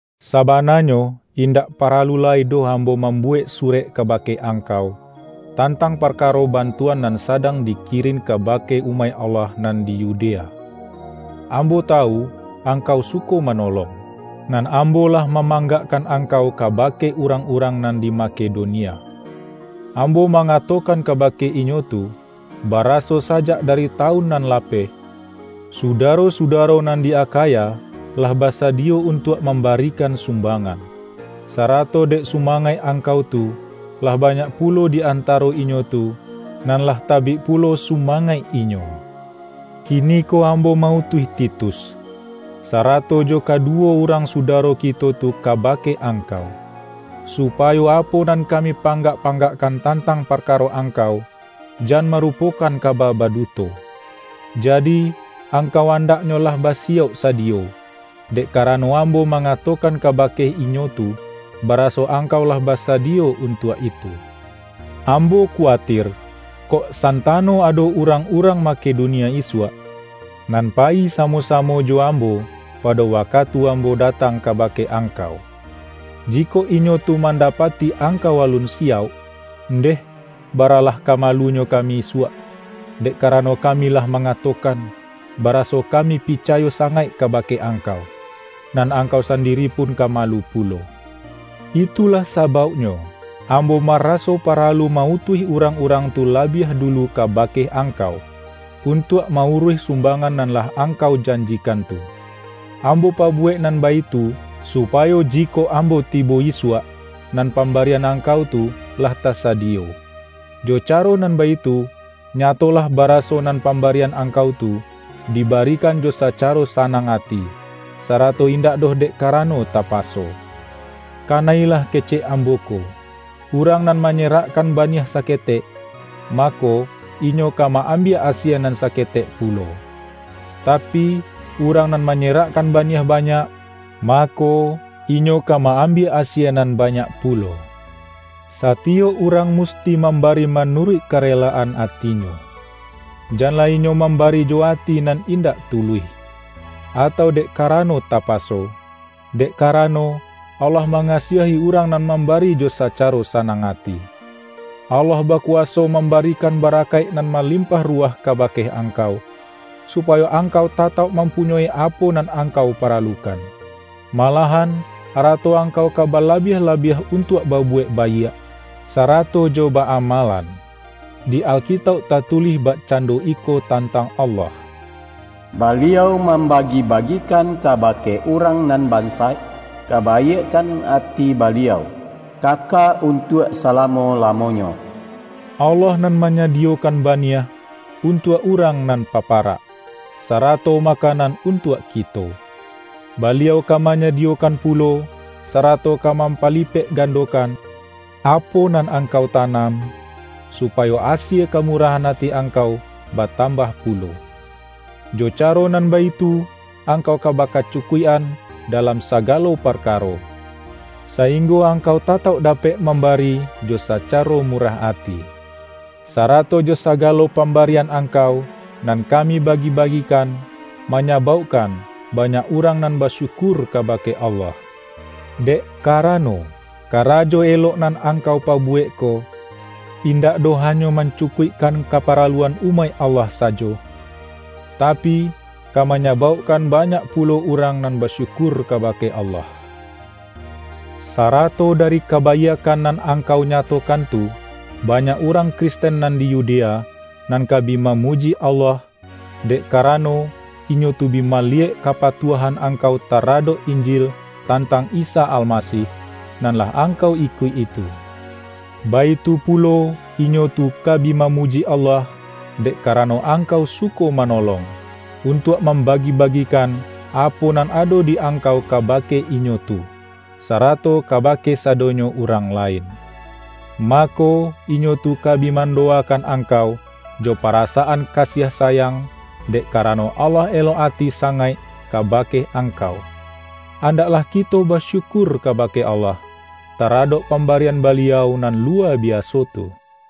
Sabananyo, indak paralu lai doh ambo mambuwek surek kabake angkau, tantang parkaro bantuan nan sadang dikirin kabake umaik Allah nan di Yudea. Ambo tawu angkau suko manolong, nan ambo lah ma-manggakkan angkau kabake urangurang nan di Makedonia. Ambo ma-ngatokan kabake inyo tu, baraso sajak dari tawun nan lapeh, sudaro-sudaro nan di Akhaya, lah basadiyo untuak mambarikan sumbangan. Sarato dek sumangaik angkau tu, lah banyak pu-lo di antaro inyo tu, nan lah tabik pu-lo sumangaik inyo. Kiniko ambo ma-utuih Titus, sarato jo kaduwo urang sudaro kito tu kabake angkau, supa-yo apo nan kami panggak-panggakkan tantang parkaro angkau, jan marupo-kan kaba baduto. Jadi, angkau andak-nyo lah basiyauk sadiyo, dek karano ambo mangatokan kabake inyo tu, ba-raso angkau lah basadiyo untuak itu. Ambo kuatir, kok santano ado urang-urang Makedonia isuak, nan payi sa-mo-samo jo ambo, pado wakatu ambo datang kabake angkau. Jikok inyo tu mandapati angkau alun siyauk, ndeh, baralah ka malunyo kami isuak, dek karano kami lah mangatokan, bara-so kami picayo sangaik kabake ang-kau! Nan angkau sandiri pun ka malu pulo. Itulah sabauknyo, ambo ma-raso paralu ma-utuih urang-urang tu labiah dulu kabake angkau, untuak ma-uruih sumbangan nan lah ang-kau janjikan tu. Ambo pabuwek nan baitu, supayo jikok ambo tibo isuak, nan pambarian angkau tu lah tasadi-yo. Jo caro nan baitu, nyatolah bara-so nan pambarian angkau tu, dibari-kan jo sacaro sanang ati, sarato indak doh dek karano tapaso. Kana-ilah kecek ambo ko! Urang nan manyerakkan baniah saketek, ma-ko, inyo ka ma-ambiak asie nan sake-tek pulo. Tapi, urang nan manyerakkan baniah banyak, mako, inyo ka ma-am-biak asie nan banyak pulo. satiyok urang musti mambari manuruik kare-laan atinyo. Janlah inyo mambari jo ati nan indak tuluih, atau dek karano tapaso, dek karano, Allah mangasiahi urang nan mambari jo sacaro sanang ati. Allah bakuwaso mambarikan barakaik nan malimpah ruwah kabake angkau, supayo angkau tatauk mam-punyoi apo nan angkau paralukan; malahan arato angkau ka balabiah-labiah untuak babuwek baiak, sara-to jo ba-amalan. Di Alkitauk tatulih bakcando iko tantang Allah,”Baliau mambagi-bagikan kabake urang nan bansaik; kabaiakkan ati Baliau kaka untuak salamo-lamonyo.” Allah nan manyadiyokan baniah, un-tuak urang nan paparak, sarato makanan untuak kito. Baliau ka manyadiyokan pulo, sarato ka mampalipek-gandokan apo nan angkau tanam, supayo asie kamurahan ati angkau batambah pulo. Jo caro nan baitu, angkau ka bakacu-kuik-an dalam sagalo parkaro, sainggo angkau tatauk dapek mambari jo sacaro murah ati. Sarato jo sagalo pambarian angkau, nan kami bagi-bagikan, manya-baukkan banyak urang nan basyukur kabake Allah. Dek karano, karajo elok nan angkau pabuwek ko, indak doh hanyo mancukuikkan kaparaluan umaik Allah sajo, tapi, ka manyabauk-kan banyak pulo urang nan basyukur kabake Allah. Sarato dari kabaiakkan nan angkau nyatokan tu, banyak urang Kristen nan di Yudea, nan ka bi mamuji Allah, dek karano, inyo tu bi maliyek ka-patuahan angkau taradok Injil tantang lsa Almasih, nan lah angkau ikuik-i tu. Baitu pulo, inyo tu ka bi mamuji Allah, dek karano angkau suko manolong, un-tuak mambagi-bagikan apo nan ado di angkau kabake inyo tu, sarato kabake sadonyo urang lain. Mako, inyo tu ka bi mandowakan angkau, jo parasaan kasiah sayang, dek karano Allah elok ati sangaik kabake angkau. Andaklah kito basyukur kabake Allah, taradok pambarian Baliau nan luwa biaso tu!